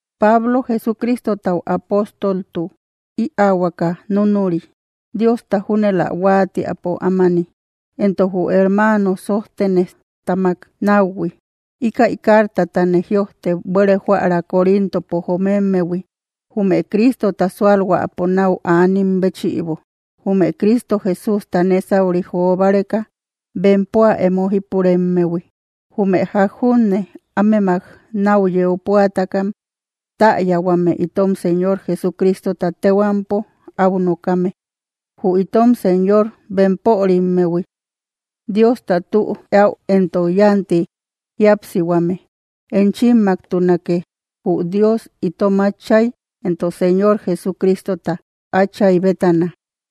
Pablo, Jesucristotau apóstoltu ïaahuaka núnuri, Diosta júnel ä huáatiäpo ámani, entok jü hermano Sójtenejtáamak náuhui, ikay cartatane jïojte buere joära Corintopo jomemmehui jume Cristota sualhuäpo nau anim béchïbo, jume Cristo Jesústa nésauri jo báreka bempoa emo jípuremmehui, jume ják júne anemmak nau yeu púataka täyahuame itom Señor Jesucristota tehuampo au nokame, jü itom Señor entok bempörimmehui. Diosta tü eäu entok yánti jíapsihuame enchimmaktunake, jü Dios itom Átchay entok Señor Jesucristota Áchay bétana.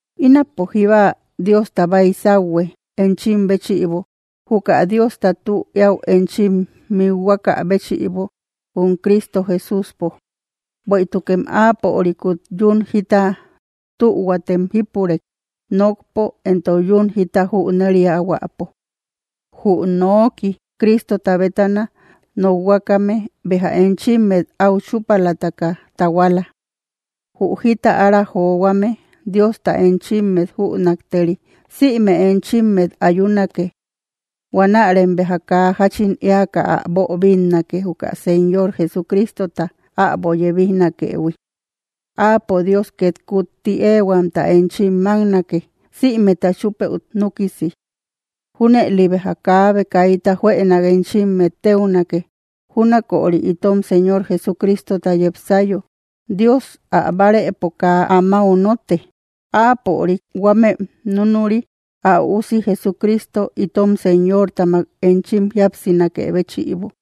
Ínapo jíba Diosta baysauhue enchim béchïbo, juka Diosta tü eäu enchim mikhuakä béchïbo jum Cristo Jesúspo. Bueïtukem áapörikut yún jita tühuatem jípurek, nokpo entok yún jita jüneriahuäpo. Jü noki Cristota bétana nokhuakame béja enchimmet au chúpalataka tahuala. Jü jita ára johuame Diosta enchimmet jünakteri sïme enchimmet ayunake. Huanärem béja kaa jáchin éaka ä boobinnake, juka Señor Jesucristota äbo yebijnakëhui. Áapo Dios ket kutti ehuamta enchim máknake, sïmeta chúpëu núkisi. Júnëli béja kaabe kaita juënak enchimmet téunake, júnaköri itom Señor Jesucristota yepsayo. Dios ä bárëpo kaa amáu notte, áapörik huamem nunuri ä üusi Jesucristo itom Señortamak enchim jíapsinakë béchïbo.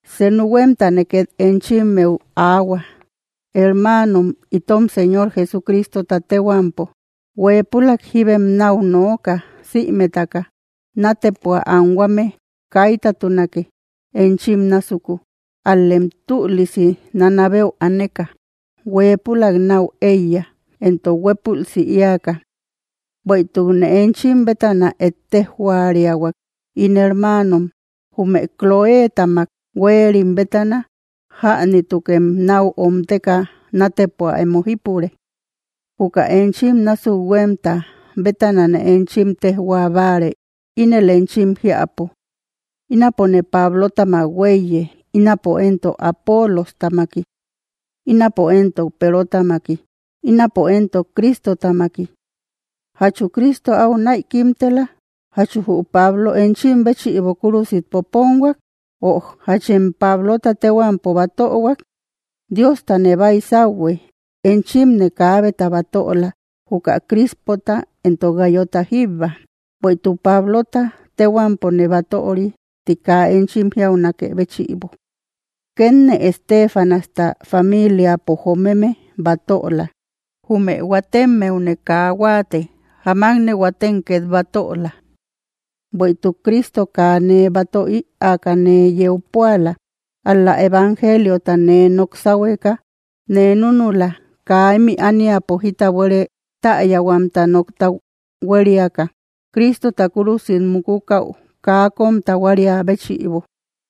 Senu huemtane, ket enchimmeu aahua, hermaanom, itom Señor Jesucristota tehuampo, huepülak jibem nau nooka sïmetaka, natepua anhuame kaytatunake enchim násuku, al‑lem tülisi nanabeu aneka huépülaik nau eiya entok huepulsi eaka. Bueïtukne enchim bétana ettejoriahuak, ín hermanom, jume Cloétamak huerim bétana, jänitukem nau omteka nátepua emo jípure. Juka enchim násuk huemta bétanane enchim tejhuabáare ínel enchim jiapo: “Ínapone Pablotamak huéiye”; ö “Ínapo entok Apoolostamaki”; “Ínapo entok Perotamaki”; ö “Ínapo entok Cristotamaki.” ¿Jachu Cristo au näikimtela? ¿Jachu jü Pablo enchim béchïbo kúrusit poponhuak? Ö ¿jachem Pablota tehuampo batöhuak? Diostane baysauhue enchimne kaabeta batöla, juka Crispota entok Gayota jíbba, bueïtuk Pablota tehuampone batöri ti kaa enchim jíaunakë béchïbo. Kenne Estéfanasta familiapo jomeme batöla; jume huatemmeune kaa huate jaamakne huatem ket batöla. Bueïtuk Cristo kaa nee batö ïaka nee yeu puaala, ál‑la evangeliota nee nok sahueka nee núnula; kaa ímï ániapo jita buere täyahuamta nokta hueriaka, Cristota kúrusit múkukau kaa kom tahuaria béchïbo.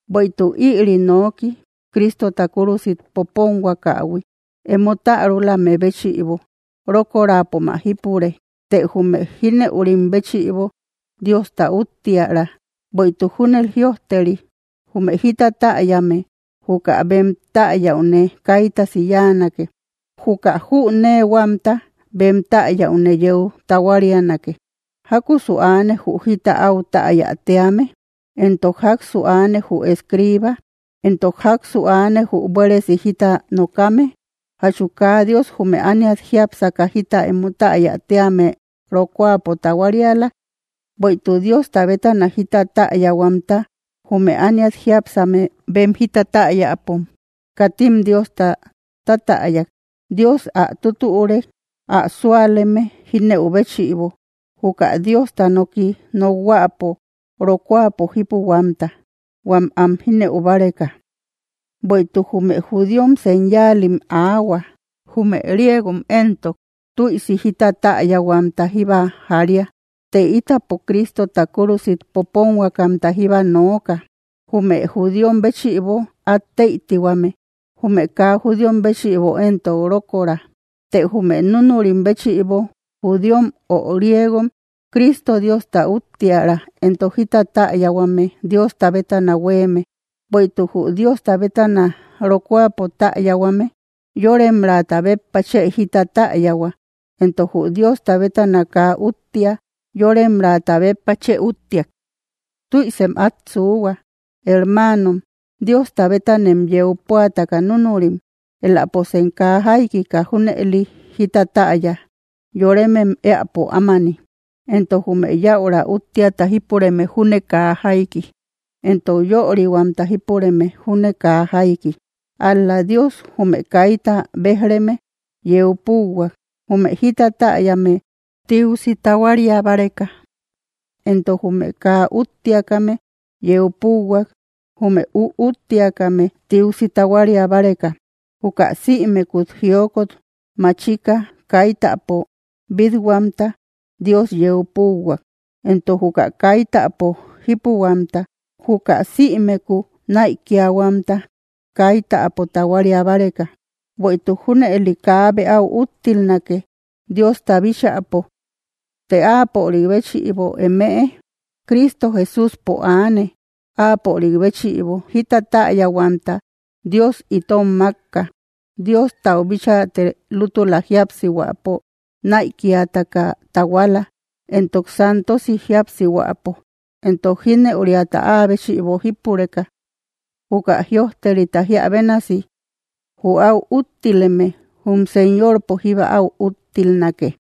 Bueïtuk ïri noki Cristota kúrusit poponhuakähui emo tärulame béchïbo rokorapom ä jípure, të jume jineurim béchïbo, Diosta uttiära. Bueïtuk júnel jïojteri: Jume jita täyame, juka bem täyaune kaytasi yáanake, juka jüneehuamta bem tayaune yeu tahuarianake. ¿Jakusu aane jü jita áu täyáa tíame? Entok jaksu aane jü escriba, entok jaksu aane jü buéresi jita nokame, ¿jachu kaa Dios jume ániat jiápsaka jita emo täaya tíame rokuapo tahuariala? Bueïtuk Diosta bétana jita täyahuamta, jume ániat jiápsame bem jita täyapom katim Diosta tatäyak, Dios ä tutürek ä súaleme jinëu béchïbo juka Diosta noki nokhuäpo rokuapo jipuhuamta huam am jínëu báreka. Bueïtuk jume judíom señalim aahua, jume griegom entok tuïsi jita täyahuamta jíba jaria; të itapo Cristota kúrusit poponhuakamta jíba nooka, jume judíom béchïbo at teïtihuame, jume kaa judíom béchïbo entok rókoora; të jume núnurim béchïbo, judíom ö griegom, Cristo, Diosta uttiära, entok jita täyahuame Diosta bétana huéeme. Bueïtuk jü Diosta bétana rokuapo tayahuame, yoremraata béppa chë jita täyahua, entok jü Diosta bétana kaa úttia, yoremraata béppa chë úttiak. Tüisem at suuhua, hermanom, Diosta betanem yeu púataka núnurim, eläposem kaa jaikika junëli jita täya yoremem eäpo ámani, entok jume yaüra uttiäta jípureme júne kaa jaiki, entok yörihuamta jipureme júne kaa jaiki. Ál-la, Dios jume kayta bejreme yeu púuhuak, jume jita täyame tiusi tahuaria báreka, entok jume kaa úttiakame yeu púuhuak jume üúttiakame tiusi tahuaria báreka. Juka sïmekut jiokot maachika kaitäpo bit-huamta Dios yeu púuhuak entok juka kaitäpo jipuhuamta, juka sïmeku naïkiahuamta kaitäpo tahuaria báreka, bueïtuk junëli kaabe áu úttilnake Diosta bíchäpo. Të áapörik béchïbo emëe Cristo Jesúspo aane, áapörik béchïbo jita täyahuamta Dios itom makka, Diostau bíchaate lútula jíapsihuäpo naïkiataka tahuala, entok santosi jíapsihuäpo, entok jinëuriata áa béchïbo jípureka. Juka jïojterita jiá bénasi: “Jü áu úttileme, jum Señorpo jíba au úttilnake.”